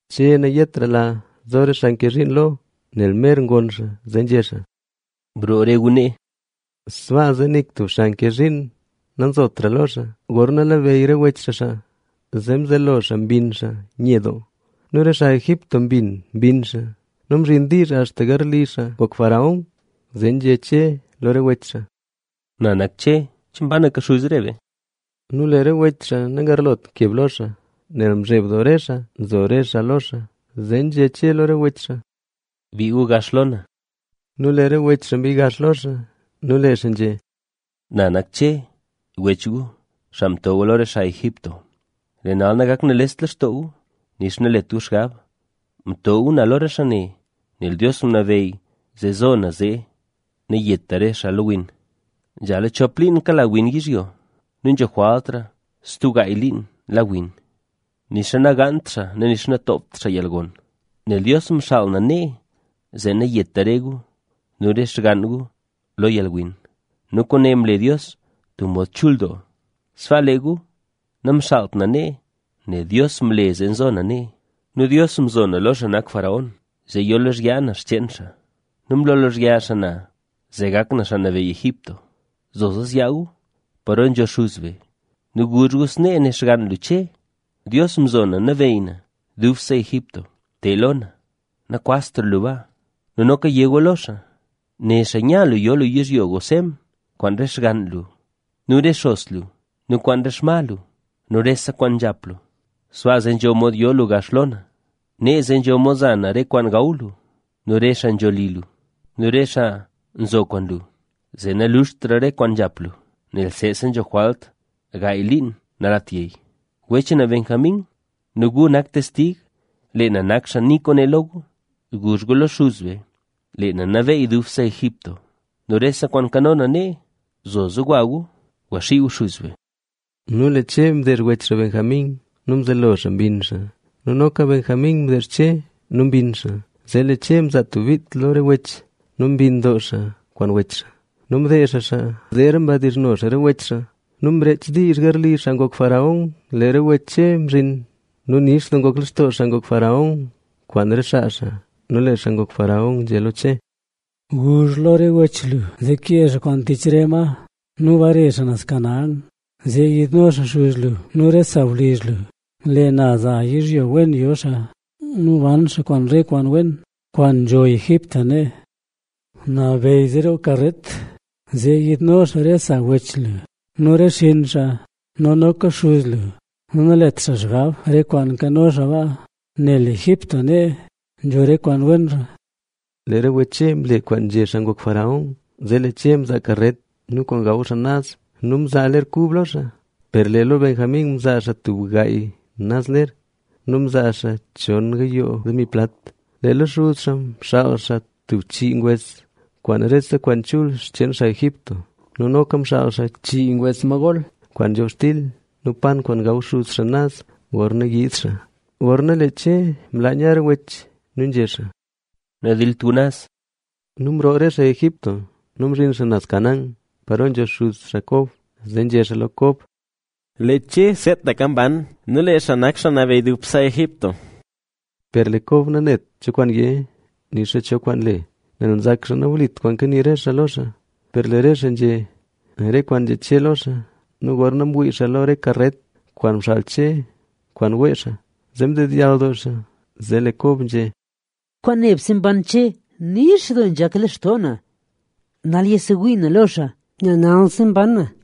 Che nayetrala zo re xaa nke zhiin lo xaa, nel mer goon xaa, zee nzhé xaa: —Broo re gu nee. Sbaa zee nik tub xaa nke zhiin nanzotra lo xaa, gorna labeyy re wech xaa xaa. Zee mzelo xaa mbinn xaa nye doo. Nu re xaa Egipto mbin mbinn xaa nu mzhin diizh axta garli xaa ngok faraón. Zee nzhé Che lo re wech xaa: —Na nak Che. ¿Che mbanaka xuz re be? Nu lee re wech xaa nagarlotra keb lo xaa, nel mzheb doo re xaa nzo re xaa lo xaa. Zee nzhé Che lo re wech xaa: —Bii gu gax lo na. Nu lee re wech xaa mbii gax lo xaa. Nu lee xaa nzhé: —Na nak Che wech gu, xaa mto gu lo re xaa Egipto. Lee nal nagakt nales lextoo gu, nixa nalet gu xgab. Mto gu na lo re xaa ne, nel Dios ngunabeyy zee zo na, zee nayeta re xaa lo yalwin. Nzhala chop liin kala win yizhyo. Nu nzho jwaltra stub gaay liin la win, nixa nagaant xaa nu nixa natoopt xaa yalgon. Nel Dios mxaal na nee, zee nayeta re gu nu re xgann gu lo yalwin, ¡nu kwaane mle Dios tub mod chul doo! Sbaa lee gu namxaalt na nee, nel Dios mle zee nzo na nee. Nu Dios mzo na lo xaa nak faraón, zee yo lozhyaa na xcheen xaa. Nu mlo xaa lozhyaa na, zee gak na xaa nabeyy Egipto. Zoza zyaa gu paro nzho xuz be nu guzh gu snee né xgann lu Che: “Dios mzo na nabeyy na dubse Egipto. Te lo na, nakwaztra lu baa.” Nu noka yé gu lo xaa: “Né xaa nya lu yo lu yizhyo Gosén kwaan re xgann lu nu re xos lu nu kwaan re xma lu nu rese kwaan nzhap lu. Sbaa zee nzho mod yo lu gax lo na. Nee zee nzho mod za na re kwaan gaw lu nu re xaa nzho li lu nu re xaa nzo kwaan lu, zee naluxtra re kwaan nzhap lu, nel seese nzho jwalt gaay liin nalat yey”. Wech na Benjamín nu gu nak testig, leeka na nak xaa nii kwaane lo gu. Guzh gu lo xuz be, lee na nabeyy dubse Egipto nu rese kwaan nkano na nee. Zoza gwa gu, gwaxii gu xuz be. Nu lee Che mdeezh wech xaa Benjamín nu mzelo xaa mbinn xaa. Nu noka Benjamín mdeezh Che nu mbinn xaa. Zee lee Che mzaa tub bit lo re wech nu mbinn doo xaa kwaan re wech xaa. Nu mdeezh xaa xaa. Zeera mdizhno xaa re wech xaa. Nu mreech diizh garli xaa ngok faraón, lee re wech Che mzhin. Nu nix doo ngok lextoo xaa ngok faraón kwaan re xaa xaa. Nu lee xaa ngok faraón nzhé lo Che: —Guzh lo re wech lu, zee kee xaa kwaan tich re ma nu bare xaa naz Canaán. Zee yiidno xaa xuz lu nu re sawlizh lu. Lee na za yizhyo wen yo xaa nu ban xaa kwaan re kwaan wen, kwaan nzho Egipto nee. Nabeyy zee roo karet, zee yiidno xaa re sa wech lu nu re xinn xaa nu noka xuz lu. Nu nalet xaa xgab re kwaan nkano xaa baa, nel lee Egipto nee nzho re kwaan wenra. Lee re wech Che mle kwaan nzhé xaa ngok faraón. Zee lee Che mzaa karet nu kwaan gaw xaa naz. Nu mzaa ler kub lo xaa, per lee lo Benjamín mzaa xaa tub gaay naz ler. Nu mzaa xaa chon gayoo demi plat. Lee lo xuz xaa mxaal xaa tub chii ngwes kwaan rese kwaan chul xcheen xaa Egipto; nu noka mxaal xaa chii ngwes ma gol kwaan nzhobxtil nu yat kwaan gaw xuz xaa naz gorna yiid xaa. Gorna lee Che mlaa nya re wech nu nzhé xaa: —Nadilt gu naz. Nu mroo re xaa Egipto nu mzhin xaa naz Canaán, paro nzho xuz xaa Kob. Zee nzhé xaa lo Kob: —¡Lee Che seetaka mban nu lee xaa nak xaa nabeyy dubse Egipto! Per lee Kob nanet cho kwaan yé nixa cho kwaan le, nel nzak xaa nawlit kwaan kanii re xaa lo xaa. Per lee re xaa nzhé re kwaan nzhé Che lo xaa nu gorna mwii xaa lo re karet kwaan mxaal Che kwaan wee xaa, zee mdedyall doo xaa. Zee lee Kob nzhé: —Kwaan nebse mban Che, nix doo nzhak lextoo na. ¡Nal yasewii na lo xaa, nel nalsi mban na!